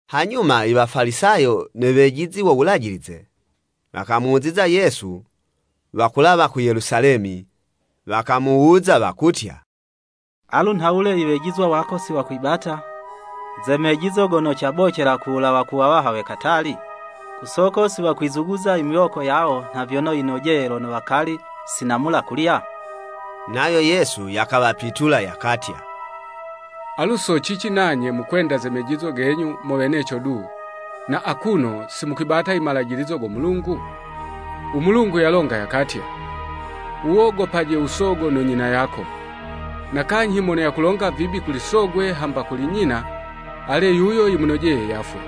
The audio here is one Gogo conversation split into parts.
Hanyuma i Wafalisayo ne wejizi wo Wulajilize, wakamuziza Yesu, wakulawa ku Yelusalemi, wakamuwuza wakutya, “Alu nhawule i wejizwa wako si wakwibata ze mejizo gono cabocela kuwulawa ku wawaha we katali? Ku soko si wakwizuguza miwoko yawo nha vyono yinojeye lono wakali si namula kulya?” Nayo Yesu yakawapitula, yakatya, “Alu so cici nanye mukwenda ze mejizo genyu mo weneco du, na akuno si mukwibata i malajilizo go Mulungu?” U Mulungu yalonga yakatya, “U wogopaje u sogo no nyina yako, na kanyhi mono yakulonga vibi kuli sogwe hamba kuli nyina, ale yuyo yimunojeye yafwe.”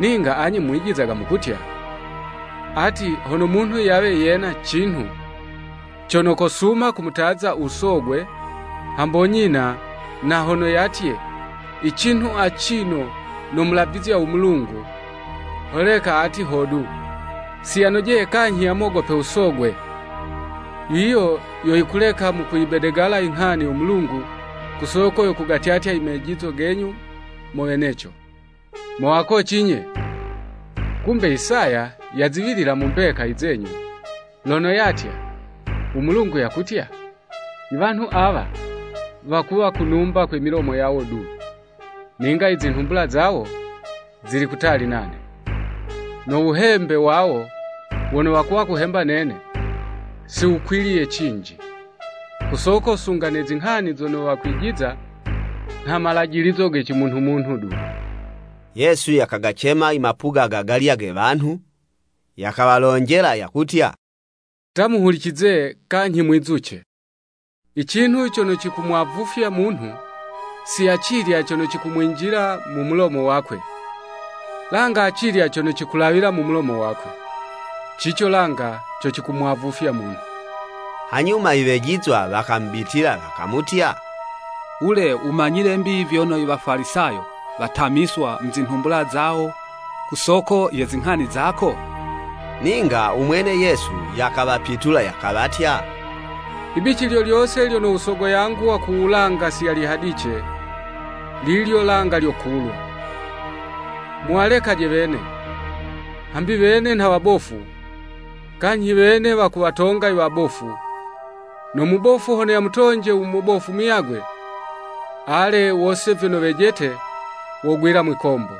Ninga anye mwijizaga mukutya, ati, hono munhu yawe yena cinhu cono kosuma kumutaza u sogwe hambo nyina, na hono yatye, “I cinhu acino namulavizya u Mulungu, holeka ati hodu, siyanojeye kanyhi yamogope u sogwe! Yiyo yo yikuleka mukuyibedegala inghani yo Mulungu ku soko yo kugatyatya i mejizo genyu mo weneco.” Mo wakoci nye! Kumbe Isaya yaziwilila mu mbeka izenyu, lono yatya “U Mulungu yakutya, Iwanhu awa wakuwa kunumba kwe milomo yawo du. Ninga i zinhumbula zawo, zili kutali nane. No wuhembe wawo wono wakuhemba nene, si wukwiliye cinji, ku soko sunga ne zinghani zono wakwijiza, nha malajilizo ge cimunhu-munhu du.” Yesu yakagacema i mapuga gagalya ge wanhu, yakawalonjela yakutya, “Ta muhulicize, kanyhi mwizuce! I cinhu cono cikumwavufya munhu, si acilya cono cikumwinjila mu mu mulomo wakwe, langa acilya cono cikulawila mu mulomo wakwe. Cico langa co cikumwavufya munhu.” Hanyuma i wejizwa wakamubitila, wakamutya, “Wule wumanyile'mbi vyono i Wafalisayo watamiswa mu zinhumbula zawo, ku soko ye zinghani zako?” Ninga u mwene Yesu, yakawapitula, yakawatya, “Ibici lyo lyose lyono u Sogo yangu wa ku wulanga si yalihadice, lilyo langa lyokulwa. Muwalekaje wene! Hambi wene nha wabofu, kanyhi wene wakuwatonga i wabofu, no mubofu hono yamutonje u mubofu muyagwe, ale, wose vyono wejete wogwila mwikombo.”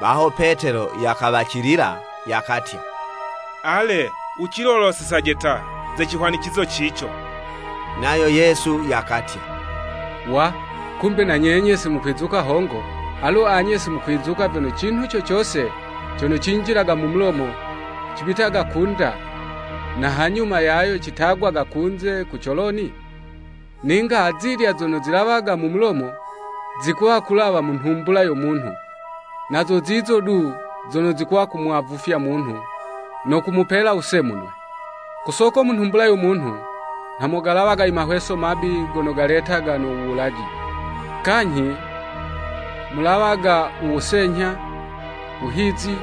Baho Petelo yakawacilila, yakatya, “Ale, wucilolosezaje ta, ze cihwanicizo cico.” Nayo Yesu yakatya, “Wa, kumbe na nyenye si mukwizuka hongo?” Alu anye si mukwizuka vyono cinhu co cose cono cinjilaga mu mulomo, cibitaga ku'nda, na hanyuma yayo citagwaga kunze ku coloni? Ninga azilya zono zilawaga mu mulomo, zikuwa kulawa mu nhumbula yo munhu, na zo zizo du, zono zikuwa kumwavufya munhu, no kumupela wusemunwe. Ku soko mu nhumbula yo munhu nha momulawaga i mahweso mabi gono galetaga no wuwulaji, kanyhi, mulawaga u wusenyha, wuhizi,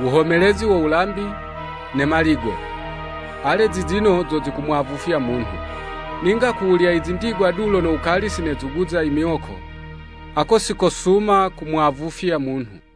wuhomelezi wo wulambi, ne maligo. Ale zizino zo zikumwavufya munhu. Ninga ku wulya i zindigwa du lono wukali si nezuguza i miwoko, ako si kosuma kumwavufya munhu.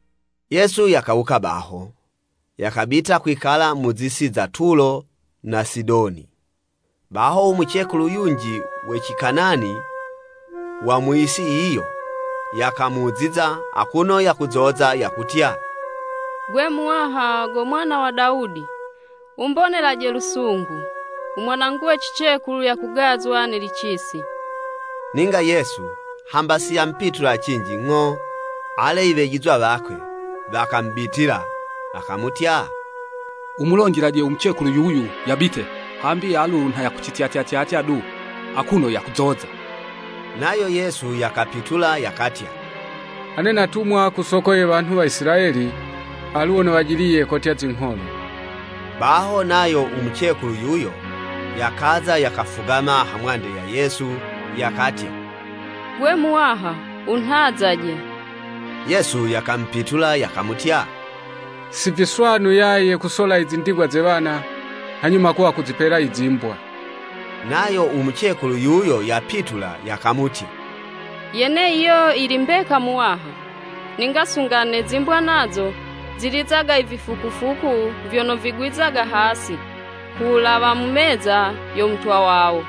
Yesu yakawuka baho, yakabita kwikala mu zi'si za Tulo na Sidoni. Baho, u mucekulu yunji we Cikanani wa mu yisi yiyo, yakamuziza, akuno yakuzoza yakutya, “Gwe Muwaha go Mwana wa Dawudi, wumbonelaje lusungu! U mwanangu we cicekulu yakugazwa ne licisi.” Ninga Yesu, hamba si yamupitula cinji ng'o. Ale i wejizwa wakwe, wakamubitila, wakamutya, “Wumulonjelaje u mucekulu yuyo yabite, hambi alu nha yakucityatya tyatya du akuno yakuzoza.” Nayo Yesu yakapitula, yakatya, “Ane natumwa ku soko ye wanhu wa Isilayeli, alu wono wajiliye kotya zingholo.” Baho nayo u mucekulu yuyo, yakaza, yakafugama hamwande ya Yesu, yakatya, “Gwe, Muwaha, wunhazaje.” Yesu yakamupitula, yakamutya, “Si viswanu yaye kusola i zindigwa ze wana, hanyuma kuwa kuzipela i zimbwa.” Nayo u mucekulu yuyo yapitula yakamutya, “Yene yiyo yili mbeka Muwaha, ninga sunga ne zimbwa nazo, zilizaga i vifukufuku vyono vigwizaga hasi, kuwulawa mu meza yo mutwa wawo.”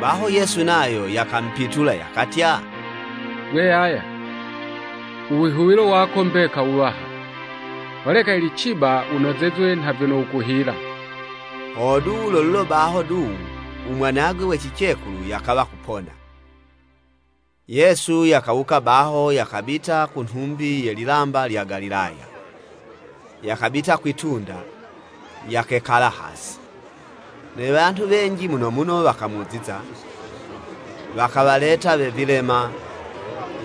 Baho Yesu nayo yakamupitula yakatya, “Gwe yaya, u wihuwilo wako mbeka wuwaha, holeka yili ciba wunozezwe nha vyono wukuhila.” Hodu, lo lulo baho du u mwanagwe we cicekulu yakawa yapona. Yesu yakawuka baho yakabita ku nhumbi ye lilamba lya Galilaya, yakabita kwi'tunda, yakekala hasi. Ne wanhu wenji muno muno wakamuziza, wakawaleta we vilema,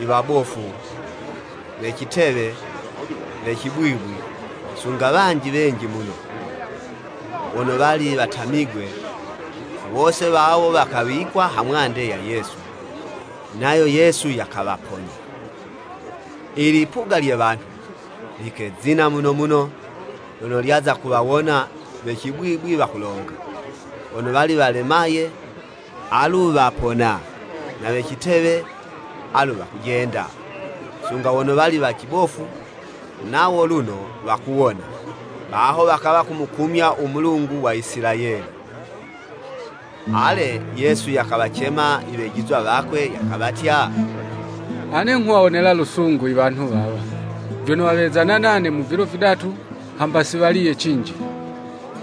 iwabofu, we citewe, we cibwibwi, sunga wanji wenji muno, wono wali watamigwe, wose wawo wakawikwa ha mwande ya Yesu, nayo Yesu yakawaponya. I lipuga lye wanhu, likezina muno muno lono lyaza kuwawona we cibwibwi wakulonga, wono wali walemaye, alu wapona, na we citewe, alu wakujenda, sunga wono wali wali cibofu, nawo luno wakuwona, baho wakawa kumukumya u Mulungu wa Isilayeli. Ale, Yesu yakawacema i wejizwa wakwe yakawatya, “Ane nghuwawonela u lusungu i wanhu wawa, vyono wawezana nane mu vilo vidatu, hamba siwaliye cinji.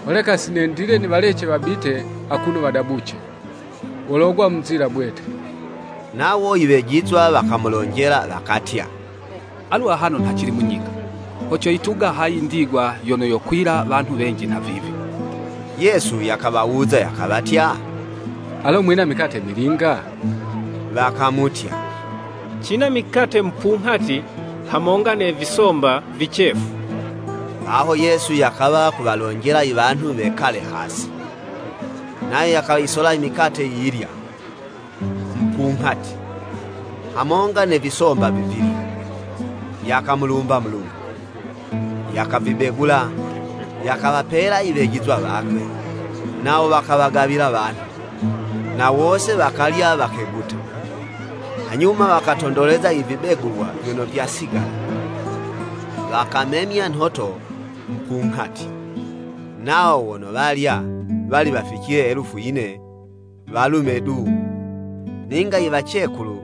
Holeka si nendile niwalece wabite akuno wadabuce, wologwa mu nzila bwete.” Nawo i wejizwa wakamulonjela wakatya, “Alu ahano nha cili mu nyika, ho coyituga hayi indigwa yono yowakwila wanhu wenji nha vivi?” Yesu yakawawuza yakawatya, “Alo mwina mikate milinga?” Wakamutya, “Cina mikate mupunghati hamonga na visomba vicefu.” Baho Yesu yakawa kuwalonjela i wanhu wekale hasi. Nayo yakayisola i mikate yiyilya, mupunghati, hamonga ne visomba vivilya, yakamulumba Mulungu, yakavibegula, yakawapela i wejizwa wakwe, nawo wakawagawila wanhu. Na wose wakalya wakeguta. Hanyuma wakatondoleza i vibegulwa vyono vyasigala, wakamemya nhoto mupunghati. Nawo wono walya, wali waficile elufu yine, walume du, ninga i wacekulu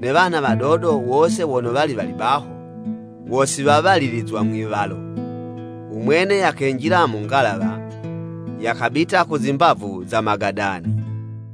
ne wana wadodo wose wono wali wali baho, wo si wawalilizwa mwi'walo. U mwene yakenjila mu ngalawa, yakabita ku zimbavu za Magadani.